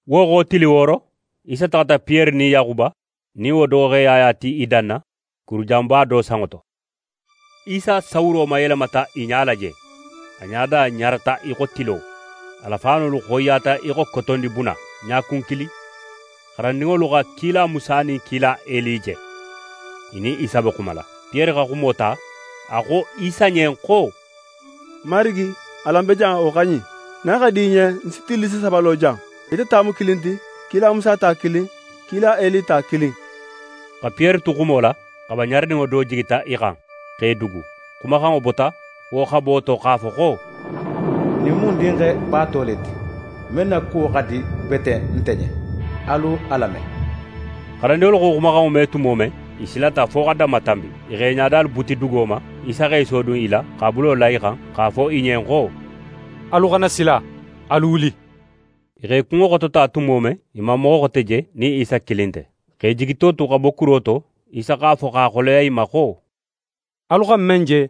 Wo xo tili wooro, Isa taxata Piyere nin Yaxuba nin wo doxoxe Yaya ti i danna, kuru janba do sanŋo to. Isa sawuro mayelemata i ɲala je. A ɲada ɲarata í xo tilo. A la faanolu xoyiyata í xo kotondibuna. Ɲakun kilin, xarandinŋolu xa kila Musa nin kila Eli je, i nin Isa be xumala. Piyere xa xumo ta, a xo Isa ɲen xo: «Marigi, alan be jan, wo xa ɲin. Nin a xa di í ɲen, ń si tillisi saba lo jan, ite ta mu kilin ti, kila Musa ta kilin, kila Eli ta kilin.» Xa Piyere tu xumo la, xaba ɲaraninŋo do jigita i xan, x'e dugu. Xumaxanŋo bota wo xabo to x'a fo xo: «Ɲin mu ń Dinxe baato le ti, men na kuwo xa di bete nte ɲen. Alu a lame!» Xarandinŋolu xa wo xumaxanŋo me tumo men, i silata fo xa danmatanbi, i x'e ɲadalu buti dugo ma. Isa x'é sodun i la, x'a bulo la i xan x'a fo i ɲen xo: «Alu xana sila, alu wuli!» I x'e kunŋo xotota tumo men, i man moxo xote je nin Isa kilin nte. Xa i jigito tu xa bo kuro to, Isa x'a fo x'a xoleya i ma xo: «Alu xa men je,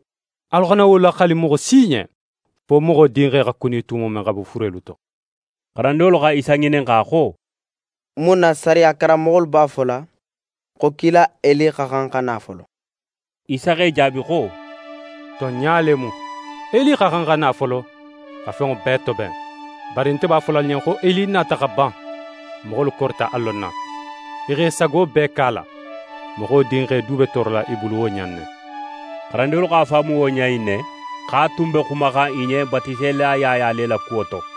alu xana wo laxali moxo si ɲen, fo Moxo Dinxe xa kuni tumo men xa bo furelu to.» Xarandinŋolu xa Isa ŋininxa xo: «Mun na sariya karanmoxolu b'a fola xo kila Eli xa xan xa na folo?» Isa x'e jaabi xo: «Tonɲa le mu, Eli xa xan xa na folo, xa fenŋo bee toben. Bari nte b'a fola alu ɲen xo Eli nata xa ban, moxolu korita a lonna. I xa i sago bee ke a la. Moxo Dinxe du be toorola i bulu wo ɲa in ne.» Xarandinŋolu x'a faamu wo ɲa in ne, xo a tun be xumaxan i ɲen Batiselila Yaya le la kuwo to.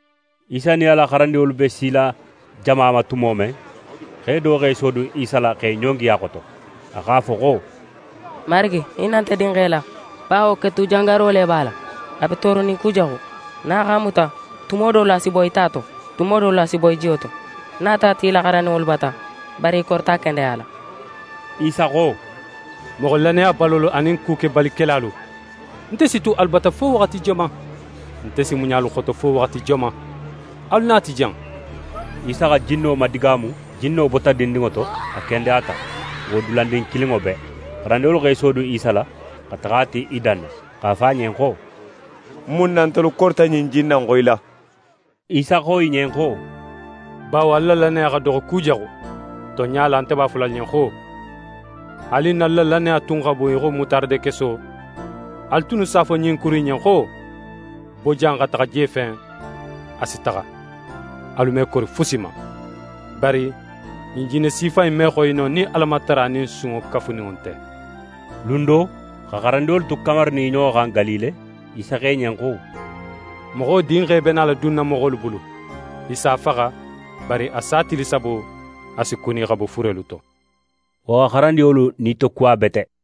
Isa nin a la xarandinŋolu be sila jama ma tumo men, xe do x'é sodun Isa la x'é ɲongi a xoto. A x'a fo xo: «Marigi, hinna nte dinxe la; bawo ketujangaro le b'a la, a be tooronin kujaxu. Nin a x'a muta, tumo dolu a si boyi ta to, tumo dolu a si boyi jiyo to. Ń nata a ti í la xarandinŋolu bata, bari i korita a kendeyala.» Isa xo: «Moxo lannayabalolu anin kukebalikelalu, nte si tu alu bata fo waxati joman? Nte si muɲa alu xoto fo waxati joman? Alu na a ti jan.» Isa xa jinno madigaamu. Jinno bota dindinŋo to, a kendeyata wo dulandin kilinŋo bee. Xarandinŋolu x'e sodun Isa la xa taxa a ti i danna, x'a fo a ɲen xo: «Mun na ntelu korita ɲin jinna in xoyila?» Isa xo i ɲen xo: «Bawo alu la lannaya xa doxo kujaxu. Tonɲa la, nte b'a fola alu ɲen xo: Haali nin alu la lannaya tun xa bun í xo mutaradekeso, alu tunnu s'a fo ɲin kuru in ɲen xo: “Bo jan xa taxa je fen”, a si taxa. Alu me kori fusi ma. [ Bari ɲin jinne sifa in me xoyi no, nin Alamatara nin sunŋo kafuninŋo nte.]» Lun do, xa xarandinŋolu tu kamarinin i ɲoxo xan Galile, Isa xo i ɲen xo: «Moxo Dinxe be nala dunna moxolu bulu. I s'a faxa, bari a sa tili sabo, a si kuni xa bo furelu to.» Wo xa xarandinŋolu nitokuwa bete.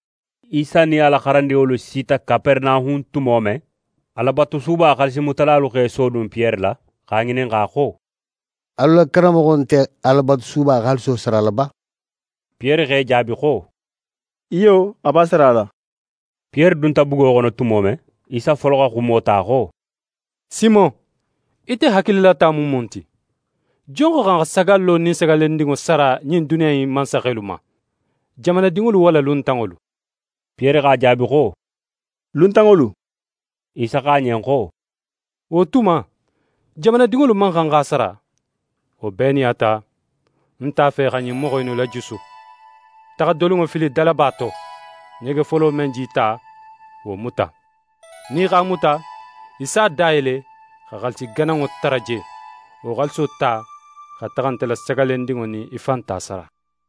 Isa nin a la xarandinŋolu sita Kaperenahun tumo men, Alabatusuba xaalisi mutalalu x'e sodun Piyere la x'a ŋininxa xo: «Alu la karanmoxo nte Alabatusuba xaaliso sarala ba?» Piyere x'e jaabi xo: «Iyo, a b'a sarala.» Piyere dunta bugo xono tumo men, Isa folo xa xumo ta xo: «Simon, ite hakililata mu mun ti? Jon xa xan xa sagallo nin sagallendinŋo sara ɲin duniya in mansaxelu ma? Jamanadinŋolu walla luntanŋolu?» Piyere x'a jaabi xo: «Luntanŋolu». Isa xo a ɲen xo: «Wo tuma, jamanadinŋolu man xan x'a sara. Wo bee nin a ta, n nte a fe xa ɲin moxo innu lajusu. Taxa dolinŋo fili dalaba to; ɲege folo men j'í ta, wo muta. Nin í x'a muta, í s'a da yele xa xaalisi gananŋo tara je. Wo xaaliso ta xa taxa nte la sagallendinŋo nin í fan ta sara.»